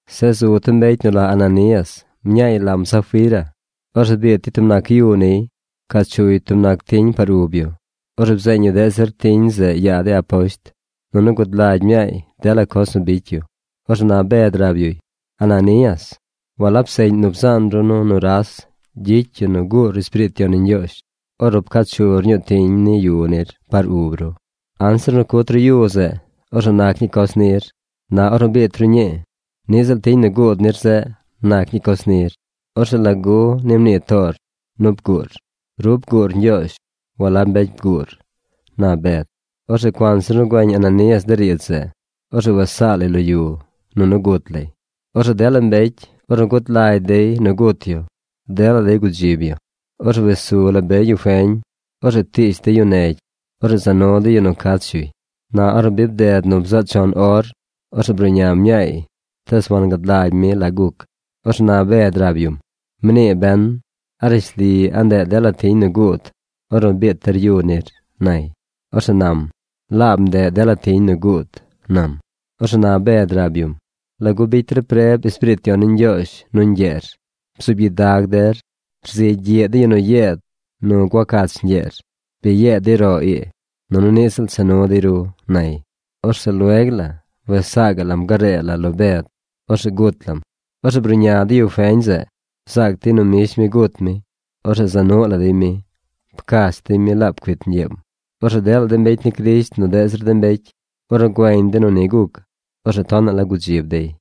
Zeꞌ zu tub mbecy nu la Ananías. Mñaay lam Safira. Orzeꞌ biit dey tub nac yu niy. Pcaa chuy tub nac tiñ par ub yu. Orzeꞌ bzeeñ yu deꞌ zir tiñ zeꞌ yaa de aposht. Nunu gud lagy mñaay dela coz nu bicy yu. Orzeꞌ na Bed rab yuy: ―Ananías, walab seꞌñ nu bzaan ru nu nuras gyicy yu nu guur Espiriit Yon ni Ñgyoozh ornu pcaa chur ñuu tiñ ni yu nir par ub ru. Anzir nu cut ru yu zeꞌ, orzeꞌ nac ñii coz nir. Na ornu biit ru ñii, niꞌ ziꞌl tiñ nu guud nir zeꞌ nac ñii coz nir. Orzeꞌ ¿lagu ni mnii toor nu bguur? Ru bguur Ñgyoozh. Walab mbecy bguur ―na Bed. Orzeꞌ cuanzir nu güeñ Ananías de riidz zeꞌ, orzeꞌ wes saa lay lo yu, nunu gut lay. Orzeꞌ dela mbecy, ornu gud lagy dey nu gut yu, dela dey gudzib yu. Orzeꞌ wes su la be yu feñ. Orzeꞌ ptiish dey yu negy. Orzeꞌ za nu dey yu nu cach yuy. Na ornu bi bi bded nu bzaꞌ chon or, orzeꞌ bruꞌña mñaay tees wangad lagy mi la guc. Orzeꞌ na Bed rab yum: ―Mnii ben ¿a rishli a ndeꞌ dela tiñ nu guud ornu biit der yu nir? ―nay. Orzeꞌ nam: ―Laab ndeꞌ dela tiñ nu guud ―nam. Orzeꞌ na Bed rab yum: ―¿Lagu bicy der preb Espiriit Yon ni Ñgyoozh nu ñgyeer? Bzuub gyidag rzigy gyiꞌ de yu nu yeed nu gua cach ñgyeer. Bi yeed dey roꞌ ii, nunu niꞌ ziꞌl cha nu dey ru ―nay. Orzeꞌ lueg la wes saa gaꞌ lam garee la lo Bed. Orzeꞌ gut lam. Orzeꞌ bruꞌña de yu feñ zeꞌ. Bzaac dey nu mbish mi gut mi. Orzeꞌ za nuꞌ la dey mi. Pcach dey mi laab cuit ñgyeem. Orzeꞌ dela de mbecy ni Crisht nu deꞌ zir de mbecy, ornu güeñ dey nu ni guc, orzeꞌ tonaꞌ la gudzib dey.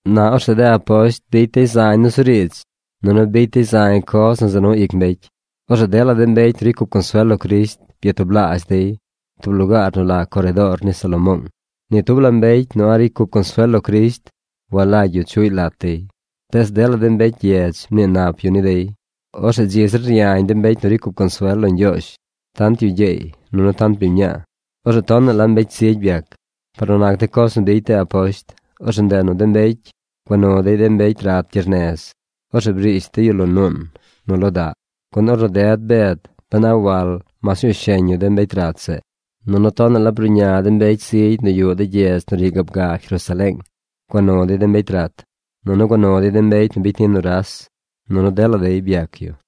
Na orzeꞌ de aposht bicy dey zañ nusuriidz, nunu bicy dey zañ coz nu za nu ic mbecy. Orzeꞌ dela mbecy nu ricy cup consuel lo Crisht byatublaazh dey tub lugaar nu la Coredoor ni Salomoong. Ni tub la de mbecy nu a̱ꞌ ricy cup consuel lo Crisht walagy yu chuꞌy lat dey, tees dela mbecy gyedz mnii nap yu ni dey. Orzeꞌ dzi zir ryañ de mbecy nu ricy cup consuel lo Ñgyoozh: tant yu gyeey nunu tant biñ mñaa. Orzeꞌ tonaꞌ la mbecy zigy byac. Par nu nac de coz nu bicy de aposht, orzeꞌ ndeꞌ nu de mbecy gua nu dey de mbecy rat gyernez. Orzeꞌ brish dey yu lo nuun nu lo daꞌ, gun ornu ded Bed ben a wal mas ñuu sheñ yu de mbecy rat zeꞌ. Nunu tonaꞌ la bruꞌña de mbecy zigy nu yuꞌ de gyedz nu ri gaab ga Jerusaleeng. Gua nu dey de mbecy rat, nunu gua nu dey de mbecy nu bicy ni nuras. Nunu dela dey byac yu.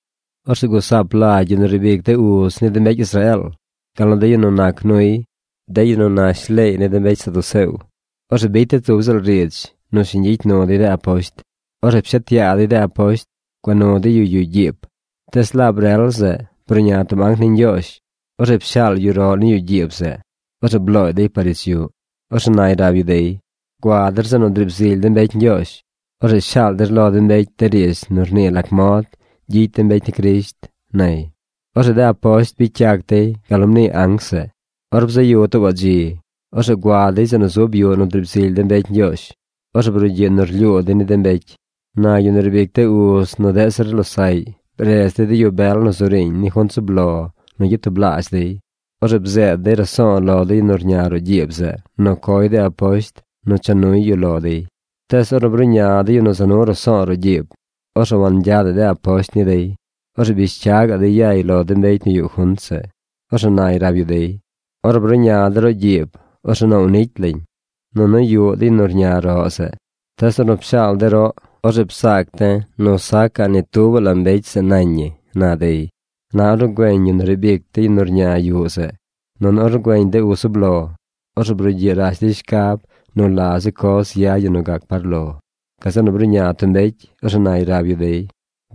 Orzeꞌ gusaap lagy yu nu riib ic de uz ni mbecy Israeel, gal nu de yu nu nac nuy, de yu nu nac nu leey ni de mbecy saduceo. Orzeꞌ bicy dey tub ziꞌl riidz nu shiñ gyicy nu dey de aposht. Orzeꞌ pshet yaa dey de aposht. Gua nu dey yu yuꞌ gyiib. Tees laab rel zeꞌ bruꞌña tub anc ni Ñgyoozh. Orzeꞌ pshaal yu roꞌ ni yuꞌ gyiib zeꞌ. Orzeꞌ blooy dey par ich yuꞌ. Orzeꞌ nay rab yu dey: ―Gua der zeꞌ nu driib zily de mbecy Ñgyoozh. Orzeꞌ shaal der lo de mbecy de riidz nu rnii lac mod gyicy de mbecy ni Crisht ―nay. Orzeꞌ de aposht bicy yac dey gal nu mnii anc zeꞌ. Or bzaꞌ yu tuubaꞌ dzi, orzeꞌ gua dey zeꞌ nu zub yuꞌ nu driib zily de mbecy Ñgyoozh. Orzeꞌ brugyiꞌ rlyuu dey ni de mbecy. Na yu nu riib ic de uz nu deꞌ zir losaꞌy bredz dey de yu bel nu zu riiñ ni junt zub lo nu gyatublaazh dey. Orzeꞌ bzeed dey raso̱o̱ lo de yu nu rña roꞌ gyiib zeꞌ nu coy de aposht nu cha nuy yu lo dey. Tees ornu bruꞌña de yu nu za nu raso̱o̱ roꞌ gyiib, orzeꞌ wangyadaꞌ de aposht ni dey. Orzeꞌ bish cya gaꞌ dey yay lo de mbecy nu yuꞌ junt zeꞌ. Orzeꞌ nay rab yu dey: ―Ornu bruꞌña de̱ roꞌ gyiib, orzeꞌ noow nicy lañ. Nunu yuꞌ de yu nu rña roꞌ zeꞌ. Tees ornu pshaal de̱ roꞌ, orzeꞌ bzaac de̱ nu sacaꞌ ni tubaꞌ la mbecy zeꞌ nañ ñi ―na dey. Na ornu güeñ yu nu riib ic de yu nu rña yuꞌ zeꞌ, nunu ornu güeñ de uz zub lo, orzeꞌ brugyiꞌ rash dey shcab nu la zi coz yad ñi nu gac par lo. Gazeꞌ nu bruꞌña tub mbecy. Orzeꞌ nay rab yu dey: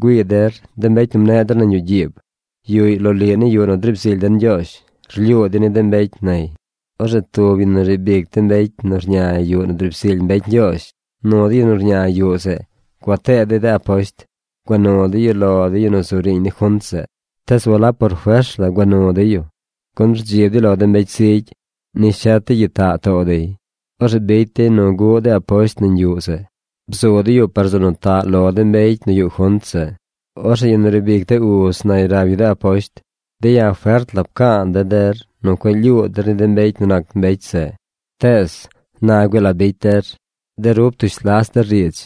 ―Güii der, de mbecy nu mneꞌ der nañ yuꞌ gyiib, yuꞌy loliꞌ ni yuꞌ nu driib zily den Ñgyoozh. Rlyuu dey ni de mbecy ―nay. Orzeꞌ tub yu nu riib ic de mbecy nu rña yuꞌ nu driib zily mbecy Ñgyoozh nu de yu nu rña yuꞌ zeꞌ gua tee dey de aposht. Gua nu dey yu lo de yu nu zu riiñ ni junt zeꞌ. Tees walab por fers la gua nu dey yu, gun rdzib dey lo de mbecy zigy nis shet dey gyitaꞌ too dey. Orzeꞌ bicy dey nu guꞌ de aposht nañ yuꞌ zeꞌ. Bzu dey yu par zeꞌ nu taꞌ lo de mbecy nu yuꞌ junt zeꞌ. Orzeꞌ yu nu riib ic de uz nay rab yu de aposht: ―De̱ ya̱ fert pca̱a̱ de̱ der nu cueꞌ lyuu der ni de mbecy nu nac mbecy zeꞌ, tees ¡na güii la bicy der! De ru ptush las der riidz,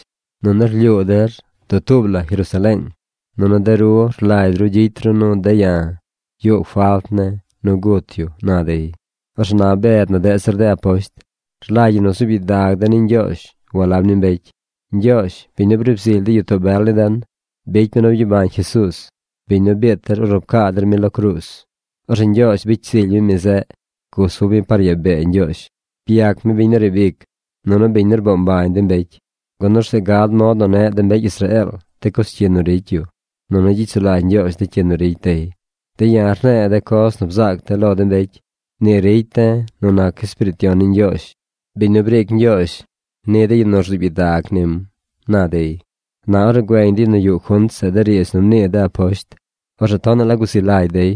nunu rlyuu der dutuub la Jerusaleeng. Nunu de ru rlagy ru gyicy ru nu de̱ ya̱ yuꞌ falt ne̱ nu gut yu ―na dey. Orzeꞌ na Bed nu deꞌ zir de aposht: ―Rlagy ñi nu zuub gyidag de̱ ni Ñgyoozh walab ni mbecy. Ñgyoozh, biñ nu briib zily de gyitoo bel ni den, bicy mi nu byabañ Jesuuz, biñ nu biit der ornu pcaa der mi lo cruuz. Orzeꞌ Ñgyoozh bicy zily mi mi zeꞌ. Gusub mi par yaa bee Ñgyoozh. Byac mi biñ nu riib ic, nunu biñ nu rboo mbañ de mbecy, gun orzeꞌ gad mod nu neꞌ de mbecy Israeel de coz cyi nu ricy yu. Nunu gyicy sulagy Ñgyoozh de cyi nu ricy dey. De̱ ya̱ rne̱e̱ de coz nu bzaac de̱ lo de mbecy. Ni ricy de̱ nu nac Espiriit Yon ni Ñgyoozh, biñ nu briic Ñgyoozh ni de yu nu rzuub gyidag nim ―na dey. Na ornu güeñ de yu nu yuꞌ junt zeꞌ de riidz nu mnii de aposht, orzeꞌ tonaꞌ la guzi lagy dey.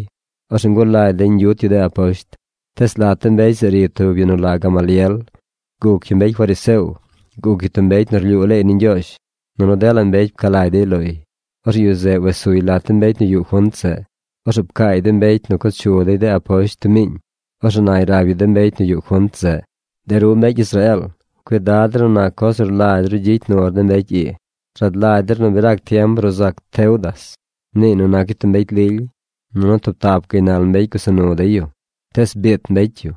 Orzeꞌ ngulagy dey ñgyut yu de aposht. Tees lat de mbecy zeꞌ ri tub yu nu la Gamaliel. Guc yu mbecy fariseo. Guc yu tub mbecy nu rlyuu leey ni Ñgyoozh. Nunu dela mbecy pca lagy dey loy. Orzeꞌ yu zeꞌ wes suy lat de mbecy nu yuꞌ junt zeꞌ. Orzeꞌ pcaay de mbecy nu co chu dey de aposht tub miiñ. Orzeꞌ nay rab yu de mbecy nu yuꞌ junt zeꞌ: ―De ru mbecy Israeel, cuidad der nu nac coz nu rlagy ru gyicy nur de mbecy ii. Rad lagy der nu bi rac tiem bruu zac Teudas. Mniiy nu nac yu tub mbecy lily. Nunu tub tap gaynal mbecy gusa nu dey yu. Tees biit mbecy yu,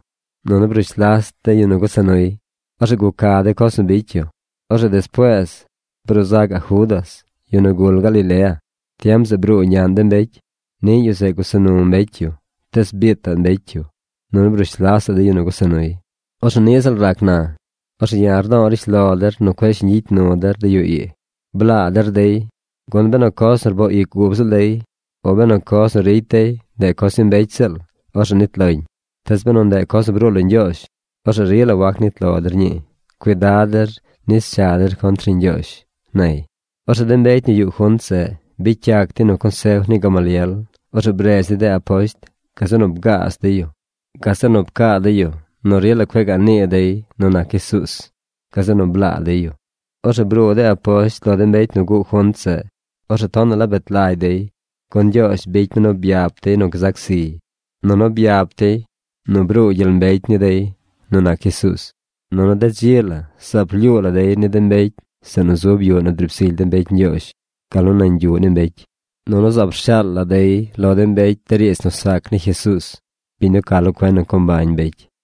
nunu brush las de yu nu gusa nuy. Orzeꞌ guca de coz nu bicy yu. Orzeꞌ despuees bruu zacaꞌ Judas, yu nu gul Galilea. Tiem zeꞌ bruu ñaꞌn de mbecy. Niꞌ yu zeꞌ gusa nu mbecy yu. Tees biitaꞌ mbecy yu, nunu brush lasaꞌ de yu nu gusa nuy. Orzeꞌ niꞌ ziꞌl rac na. Orzeꞌ ya̱ rdo̱o̱ rishlo der nu cueꞌ shiñ gyicy nu der de yu ii. Blaa der dey, gun benu coz nu rboo ic ub ziꞌl dey o benu coz nu ricy dey, ndeꞌ coz ni mbecy ziꞌl, orzeꞌ nit loñ. Tees benu ndeꞌ coz nu bruu lo Ñgyoozh, orzeꞌ rila wac nit lo der ñii. Cuidad der nis cha der contr ni Ñgyoozh ―nay. Orzeꞌ de mbecy nu yuꞌ junt zeꞌ bicy yac dey nu consef ni Gamaliel. Orzeꞌ bredz dey de aposht. Gazeꞌ nu bgaaz dey yu. Gazeꞌ nu pcaa dey yu nu rila cueꞌ gaꞌ nii dey nu nac Jesuuz. Gazeꞌ nu blaa dey yu. Orzeꞌ bruu de aposht lo de mbecy nu guꞌ junt zeꞌ. Orzeꞌ tonaꞌ la bet lagy dey, gun Ñgyoozh bicy mi nu byap dey nu gzac ziy, nunu byap dey nu bruu gyel mbecy ni dey nu nac Jesuuz. Nunu de dzi la zaab rlyuu la dey ni de mbecy zeꞌ nu zub yuꞌ nu driib zily de mbecy Ñgyoozh, gal nu nañ yuꞌ ni mbecy, nunu zaab rshaal la dey lo de mbecy de riidz nu sac ni Jesuuz, biñ nu ca lo cuen nu co mbañ mbecy.